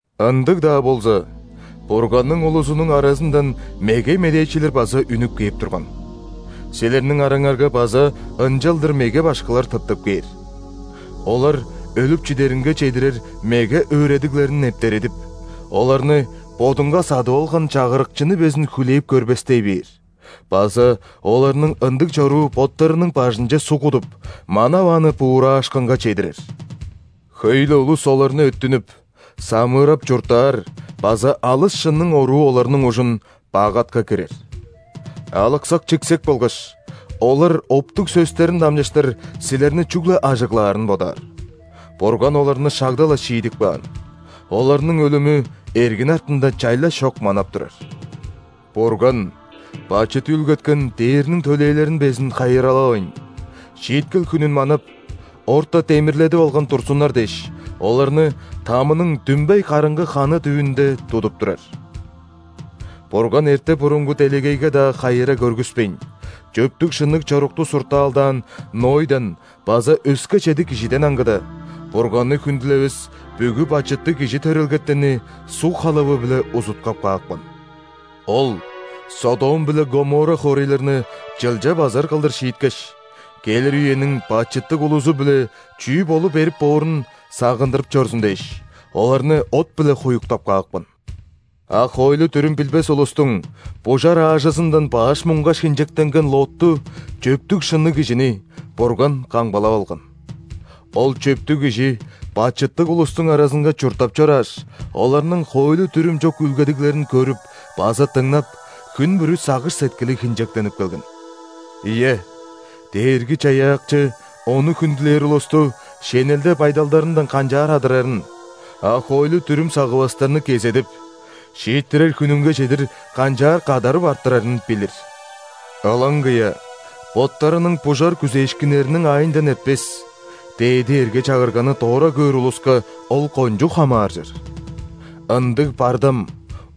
Ындыг-даа болза, Бурганның улузунуң аразындан меге медээчилер база үнүп кээп турган. Силерниң араңарга база ынчалдыр меге башкылар тыптып кээр. Олар өлүп чидеринге чедирер меге өөредиглерин нептередип, оларны Бодунга садып алган Чагырыкчыны безин хүлээп көрбестей бээр база оларның ындыг чоруу боттарының бажынче суг кудуп, манавааны буураашкынга чедирер. Хөй-ле улус оларны өттүнүп, самыырап чурттаар база алыс шынның оруу оларның ужун бак атка кирер. Алыксак-чиксек болгаш, олар оптуг сөстерин дамчыштыр силерни чүгле ажыглаарын бодаар. Бурган оларны шагда-ла шиидип каан, оларның өлүмү эргин артында чайлаш чок манап турар. Бурган бачыт үүлгеткен ·дээрниң төлээлерин безин хайыралавайн, шииткел хүнүн манап, орта демирледип алган турзуннар дээш, оларны ·тамының дүмбей караңгы ханы дүвүнде тудуп турар. Бурган эрте-бурунгу делегейге-даа хайыра көргүспейн, чөптүг-шынныг чорукту суртаалдаан Нойдан база өске чеди кижиден аңгыда, Бурганны хүндүлевес бүгү бачыттыг кижи төрелгетенни суг халавы-биле узуткап каапкан. Ол Содом биле Гоморра хоорайларны чылча базар кылдыр шииткеш, келир үениң бачыттыг улузу-биле чүү болу берип боорун сагындырып чорзун дээш, оларны от-биле хуюктап каапкан. А хоойлу-дүрүм билбес улустуң бужар аажызындан баш муңгаш хинчектенген Лотту, чөптүг-шынныг кижини, Бурган камгалап алган. Ол чөптүг кижи бачыттыг улустуң аразынга чурттап чорааш, оларның хоойлу-дүрүм чок үүлгедиглерин көрүп база дыңнап, хүн бүрү сагыш-сеткили хинчектенип келген. Ийе, Дээрги-Чаяакчы Ону хүндүлээр улусту шенелде байдалдарындан канчаар адырарын, а хоойлу-дүрүм сагывастарны кезедип, шииттирер хүнүнге чедир канчаар кадарып арттырарын билир. Ылаңгыя боттарының бужар күзээшкиннериниң аайындан эртпес, дээди эрге-чагырганы дора көөр улуска ол кончуг хамааржыр! Ындыг бардам,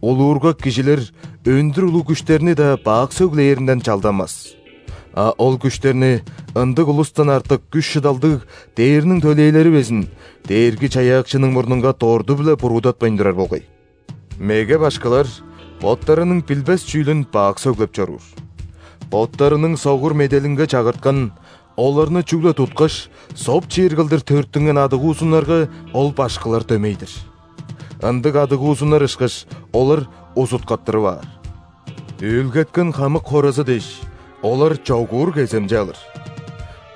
улуургак кижилер өндүр улуг күштерни-даа бак сөглээринден чалданмас, а ол күштерни ындыг улустан артык күш-шыдалдыг ·дээрниң төлээлери безин Дээрги-Чаяакчының мурнунга дорту-биле буруудатпайн турар болгай. Меге башкылар боттарының билбес чүүлүн бак сөглеп чоруур. Боттарының согур меделинге чагырткан, оларны чүгле туткаш, соп чиир кылдыр төрүттүнген адыгуузуннарга ол башкылар дөмей-дир. Ындыг адыгуузуннар ышкаш, олар узуткаттырып аар. Үүлгеткен хамык хоразы дээш, олар чогуур кеземче алыр.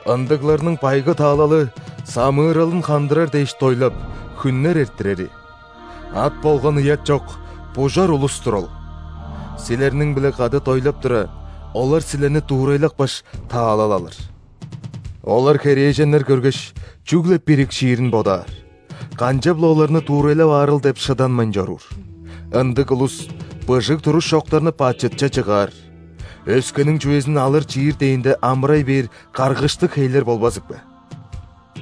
Ындыгларның байгы таалалы – самыыралын хандырар дээш дойлап, хүннер эрттирери. Ат болган ыят чок, бужар улус-тур ол! Силерниң-биле кады дойлап тура, олар силерни дуурайлапкаш, таалал алыр. Олар херээженнер көргеш, чүгле бирикшиирин бодаар, канчап-ла оларны дуурайлап аарыл деп шыданмайн чоруур. Ындыг улус – быжыг туруш чоктарны бачытче чыгаар, өскениң чүвезин алыр-чиир дээнде амырай бээр каргыштыг хейлер болбазыкпе!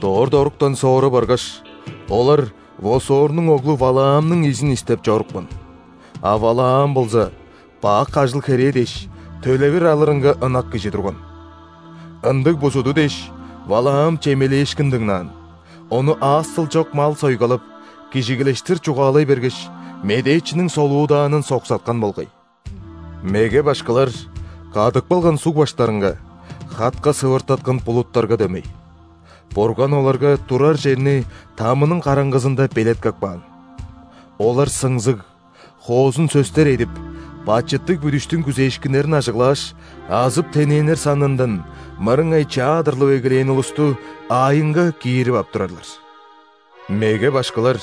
Дорт оруктан соора баргаш, олар Восорнуң оглу Валаамның изин истеп чорупкан, а Валаам болза бак ажыл-херээ дээш, төлевир алырынга ынак кижи турган. Ындыг бузуду дээш, Валаам чемелээшкин дыңнаан, ону аас-дыл чок мал сойгалап, кижигилештир чугаалай бергеш, медээчиниң солуудаанын соксаткан болгай. Меге башкылар кадып калган суг баштарынга, хатка сывыртаткан булуттарга дөмей. Бурган оларга турар черни ·тамының караңгызында белеткеп каан. Олар сыңзыг, хоозун сөстер эдип, бачыттыг бүдүштүң күзээшкиннерин ажыглааш, азып-тенээннер санындан мырыңай чаа адырлып эгелээн улусту аайынга киирип ап турарлар. Меге башкылар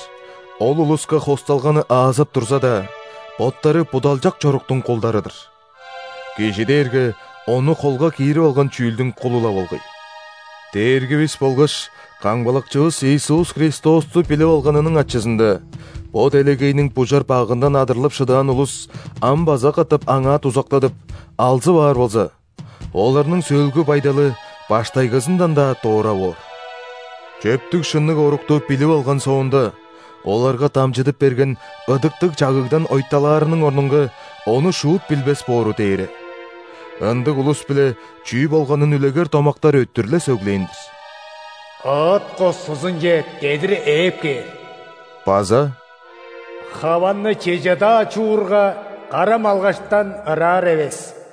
ол улуска хосталганы аазап турза-даа, боттары будалчак чоруктуң кулдары-дыр. Кижи дээрге ону холга киирип алган чүүлдүң кулу-ла болгай. Дээргивис болгаш Камгалакчывыс Иисус Христосту билип алганының ачызында бо делегейниң бужар багындан адырлып шыдаан улус ам база катап аңаа дузактадып, алзып аар болза, оларның сөөлгү байдалы баштайгызындан-даа дора боор. Чөптүг-шынныг орукту билип алган соонда, оларга дамчыдып берген ыдыктыг чагыгдан ойталаарының орнунга, ону шуут билбес боору дээре. Ындыг улус-биле чүү болганын үлегер домактар өттүр-ле сөглээн-дир: «Ыт кускузунче дедир ээп кээр» база «Хаванны чеже-даа чуурга, кара малгаштан ыраар эвес».